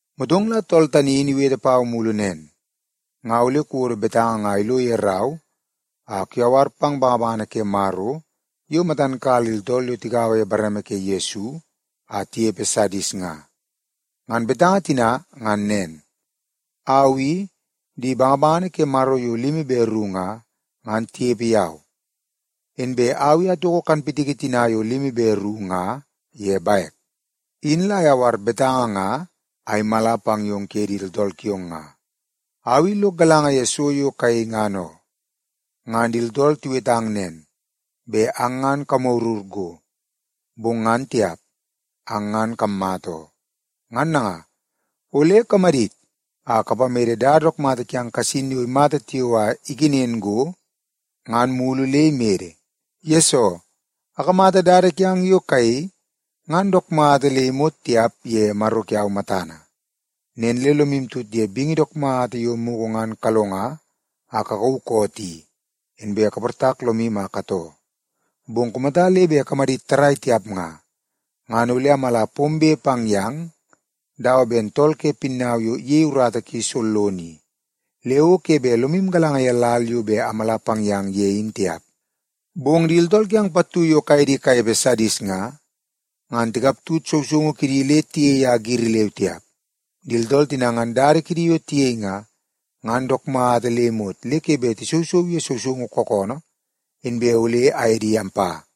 Motong la tool tani in iwete pau mulu nen, “Nga ole kuwodo betanga nga ilo ye rau a kuyawar pang bangabangana ke Maro yo matan kala di tooltool yo tigaua ye bareme ke Yesu a tinepe Sadis nga. Ngan betanga tina ngan nen: Au i, di bangabangana ke Maro yo limi be ru nga, ngan tinepe yau. Inbe au i atoko kanpitiki tina yo limi be ru nga ye bek. Au tani la ayawar betanga nga a imala pang yong kuye di tooltool kiong nga. Au i lok galanga ye so yo kayei ngan oo. Ngan di tooltool tiwetang nen, bet ang ngan kamagurur go, bong ngan tiap. Ang ngan kammata oo. Ngan nanga, ole kamadit a kapamede dada dook mata kiang kasin yo imata tiao a ikenen go, ngan mulu le imede. Yesoo, akamata dada kiang yo kayei ngan dook mata le imot tiap ye Maro kiau matana. Nen le lomu tut ye bingi dook mata yo mugu ngan kalonga a kakauu koot i, inbe kaportak lomu a katoo. Bong kumata le bet kamadit tarrai tiap nga, ngan ole amala pombe pang yang dawa ben tool ke pinnau yo iyei urata ki sollono i, le o ke bet lomu galanga ye lal yo bet amala pang yang ye in tiap. Bong di tooltool kiang pattu yo kaye di kanepe Sadis nga, ngan tikaptut sousoungu kidi le tiyei a giri leu tiap. Di tooltool tina ngan dada kidi yo tiyei nga, ngan dook mata le imot le ke bet tisousou ye sousoungu kookoonoo, inbe ole aye di ampa.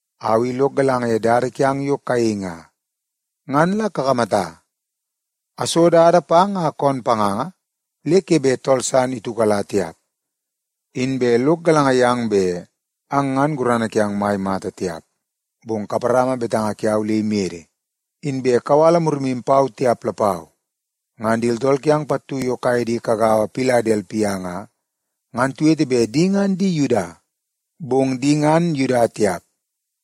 Au i lok galanga ye dada kiang yo kayei nga. Ngan la kakamata, aso dada pang a koon panganga le ke bet tool san itiukala tiap. Inbe lok galanga yang bet ang ngan gurana kiang mai mata tiap, bong kaparama betanga kiau le imede, inbe kawala murimu pau tiap lapau. Ngan di tooltool kiang pattu yo kaye di kagaua Piladelpia nga, ngan tiwete bet di ngan di Yuda. Bong di ngan Yuda tiap,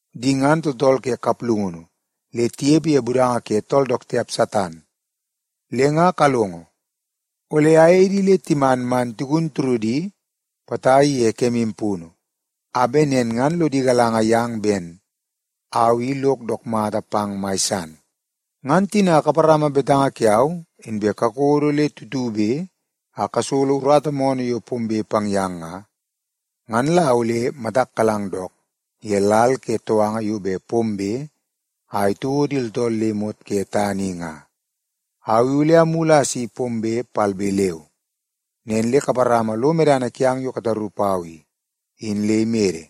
di ngan tooltool ke kaplungunu le tinepe ye budanga ke tool dook tiap Satan. Le nga kalongo, ole ayei di le timan man tigun turudi potai ye kemu punu, a bet nen ngan lodi galanga yang ben au i lok dook mata pang mai san. Ngan tina kaparama betanga kiau inbe kakodo le tutube a kasolo urata moonoo yo pombe pang yang nga, ngan la ole matak kalang dook ye lal ke touanga yo bet pombe a itouo di tooltool le imot ke tana i nga. Au i ole amulu a asi pombe palbe leu. Nen le kaparama lo medana kiang yo kataru pau i, in le imede,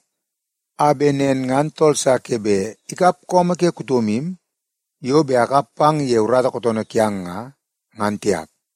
a bet nen ngan tool sa ke bet ikap su ke kutomu yo bet akap pang ye urata kootoonoo kiang nga, ngan tiap.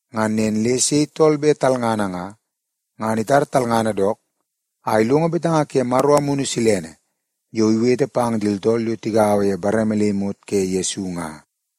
Ngan nen le sei tool bet talngana nga, ngan itar talngana dook a ilongo betanga ke Maro Amunu Silene yo iwete pang di tooltool yo tigaua ye bareme le imot ke Yesu nga.”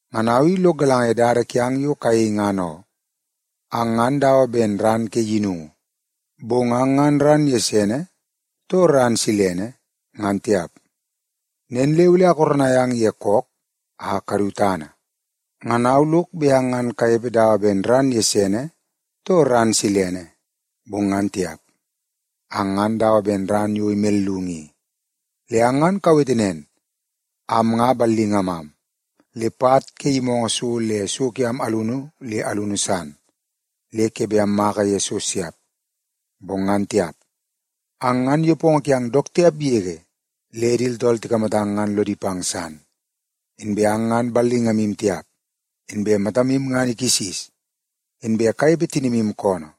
Ngan au i lok galanga ye dada kiang yo kayei ngan oo. Ang ngan dawa ben ran ke yinungu, bong ang ngan ran gesene too ran silene ngan tiap. Nen le ole akoronai ang ye kook a kadu tana. Ngan au lok bet ang ngan kanepe dawa ben ran gesene too ran silene, bong ngan tiap. Ang ngan dawa ben ran yo imellungu i. Le ang ngan kawete nen, ‘Am nga ballingamam, le pat ke yimoongoo so le so kiam alunu le alunu san le ke bet ammaka ye so siap.’ Bong ngan tiap, ang ngan nepongo kiang dook tiap yege le di tooltool tikamatang ngan lodi pang san. Inbe ang ngan ballingamu tiap, inbe matamu ngan ikisis, inbe kanepe tinimu koonoo.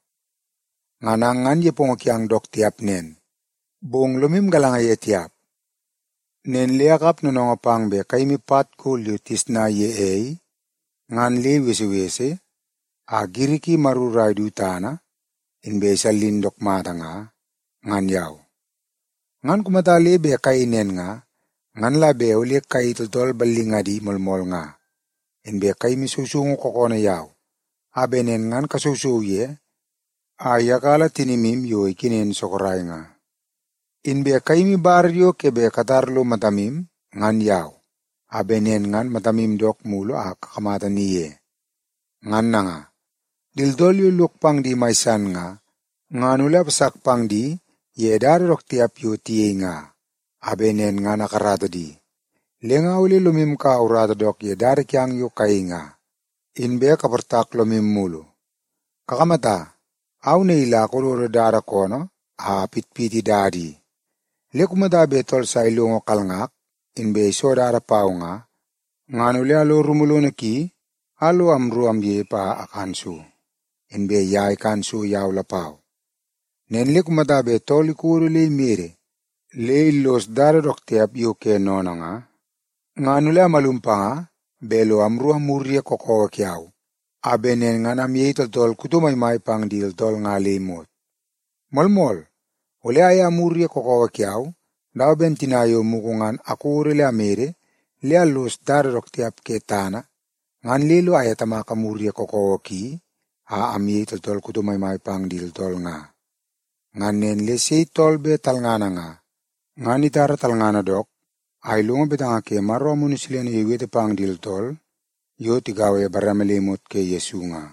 Ngan ang ngan nepongo kiang dook tiap nen, bong lomu galanga ye tiap. Nen le akap noonoongoo pang bet kayimi pat gol yo tigesnai ye ei, ngan le ibesebese a giri ki imaruru a idu tana inbe isallin dook mata nga, ngan yau. Ngan kumata le bet kayei nen nga, ngan la bet ole kayei tooltool ballingadi moolmool nga. Inbe kayimi sousoungu kookoonoo yau a bet nen ngan kasousou ye a iyakala tinimu yo ikenen sorok nga. Inbe kayimi bar yo ke bet katar lo matamu ngan yau, a bet nen ngan matamu dook mulu a kakamata ni ye. Ngan nanga, di tooltool yo lok pang di mai san nga, ngan ole apasak pang di ye dada dook tiap yo tiyei nga, a bet nen ngan akarata di. Le nga ole lomu ikaua urata dook ye dada kiang yo kayei nga, inbe kaportak lomu mulu. Kakamata, au naii la akododo dada koonoo a apitpiti dada i, le kumata bet tool sa ilongo kalngak inbe iso dada pau nga, ngan ole alo rumu lono ki a lo amru amnepe a akan so, inbe ye ikan so yau lapau. Nen le kumata tool bet ikodo le imede le illos dada dook tiap yo ke sennene nga, ngan ole amalum panga bet lo amru amwur ye kakawa kiau a bet nen ngan amyei tooltool kuto maimai pang di tooltool nga le imot. Moolmool, ole aye amwur ye kakawa kiau dawa ben tina yo mugu ngan akodo le amede le allos dada dook tiap ke tana ngan le lo aye Tamak amwur ye kakawa ki a amyei tooltool kuto maimai pang di tooltool nga. Ngan nen le sei tool bet talngana nga, ngan itara talngana dook a ilongo betanga ke Maro Amunu Silene yo iwete pang di tooltool yo tigaua ye bareme le imot ke Yesu nga.”